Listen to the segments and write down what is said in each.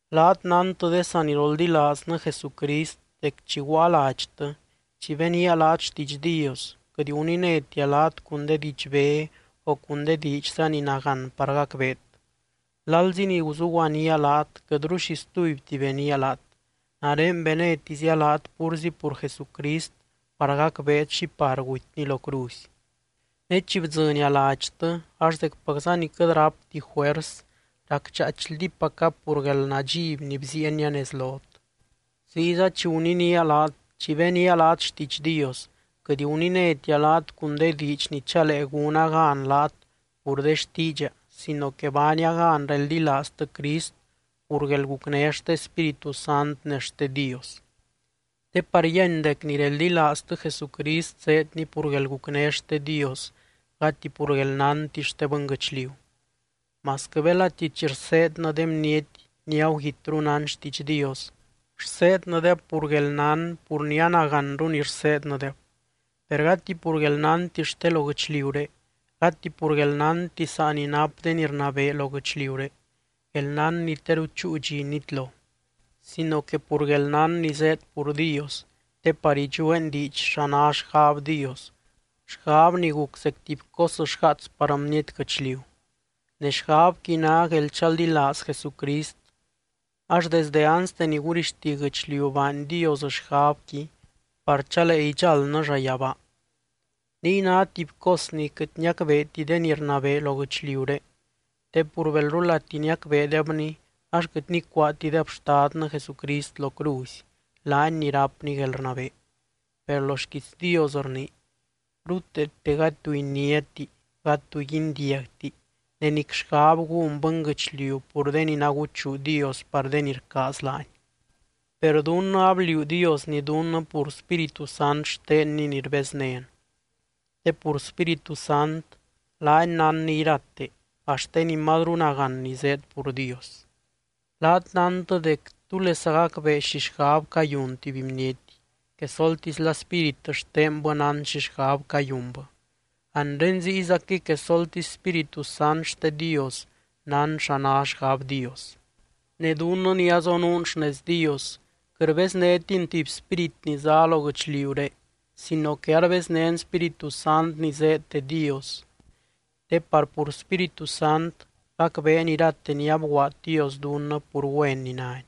Laat nántɨ de saniroldilaaznɨ Jesucrist dec chi guaa ladxtɨ, chi benía laat xtiidx Dios, quɨt guninétia laat cun de didxbé o cun de diidxza ni nagán par gacbeet. Lalzi ni guzuguanía laat quɨtru xi stubyti benía laat, nare benétizia laat púrzi pur Jesucrist par gacbeet xi par gutyny lo cruzy. Ne chi bdzɨnia ladxtɨ ax zecpacza ni quɨt rápti juers, racdxaaichldípaca pur guelnadxiby ni bziienia nez lot. Ziyza chi guninía laat, chi benía laat xtiidx Dios, quɨt guninétia laat cun de diidx ni chalee gúna gan laat pur de xtiidxa sino que baania gan reldilaaztɨ Crist pur guelgucné xte Spíritu Sant ne xte Dios. Te par yíany dec ni reldilaaztɨ Jesucrist zéedni pur guelgucné xte Dios gati pur guelnánti xte bɨnguɨchliu. Masquɨ belati chi rseednɨ de bniety ni aguguitru nán xtiidx Dios, rseednɨdeb pur guelnán pur ni anaganru ni rseednɨdeb. Per gati pur guelnánti xte lo guɨchliuré, gati pur guelnánti saa ni nap de ni rnabee lo guɨchliuré, guelnán ni teru chúu dxi nitlo. Sino que pur guelnán ni zéed pur Dios, te par idxueen diidx xa ná xgab Dios, xgab ni guc zec tuby cos xgaats par bniety guɨchliu. Ne xgabqui ná guelchaldilaaz Jesucrist, ax desdɨ anste ni gurixti guɨchliu baany Dios xgabqui par chalee idxáldnɨ llayabaa. Niy ná tuby cos ni quɨt niacbeeti de ni rnabee lo guɨchliuré, te pur belrulati niacbeedebni ax quɨt nicuaatideb Xtadnɨ Jesucrist lo cruzy, laany ni rápny guelrnabee. Per lo xquiits Dios rnii: Ruteete gady tu iniáti, gady tu guindiagti ne nic xgab gún bɨnguɨchliu pur de ni naguchuu Dios par de ni rcaaz laany. Per dunnɨ abliuu Diosni dunnɨ pur Spíritu Sant xtenny ni rbeznén, te pur Spíritu Sant laany nánny irate, axt de ni mazru nagán ni zéed pur Dios. Laat nántɨ dec, ¿túlesa gacbee xi xgab cayun tuby bniety? Quesoltisla spírit xtenbɨ nán xi xgab cayunbɨ. Anre ziyzaquɨy quesoltisy Spíritu Sant xte Dios nán xa ná xgab Dios. Ne dunnɨ ni azonuun xnez Dios, quɨt rbeznétin tuby spírit ni zá lo guɨchliuré sino que arbeznén Spíritu Sant ni zéed de Dios, te par pur Spíritu Sant gacbeen irate ni abguaad Dios dunnɨ pur güen ni nány.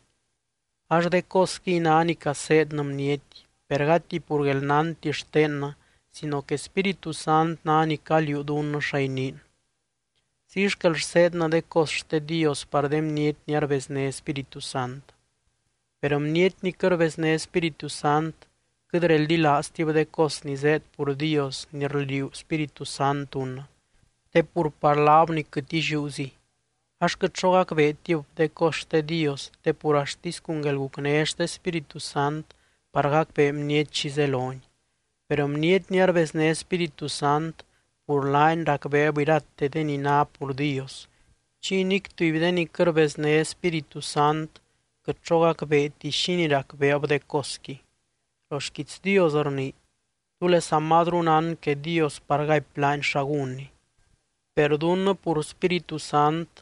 Ax de cosquiy ná ni caseednɨ bniety, per gati pur guelnánti xtennɨ sino que Spíritu Sant ná ni caliuu dunnɨ xa iniin. Ziy xquel rseednɨ de cos xte Dios par de bniety ni arbezné Spíritu Sant. Per bniety ni quɨt rbezné Spíritu Sant quɨt reldilaaztib de cos ni zéed pur Dios ni rliuu Spíritu Sant dunnɨ, te pur par laab ni quɨt illiúziy. Ax quɨt xo gacbeetib de cos xte Dios te pur axtisy cun guelgucné xte Spíritu Sant par gacbee bniety xi zeloni. Per bniety ni arbezné Spíritu Sant pur laany racbeeb irate de ni ná pur Dios, chiy nic tuby de ni quɨt rbezné Spíritu Sant quɨt xo gacbeeti xínii racbeeb de cosqui. Lo xquiits Dios rnii: “¿Túlesa mazru nán que Dios par gaipy laany xa gúnny?” Per dunnɨ pur Spíritu Sant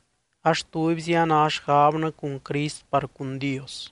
ax tubyzi a ná xgabnɨ cun Crist par cun Dios.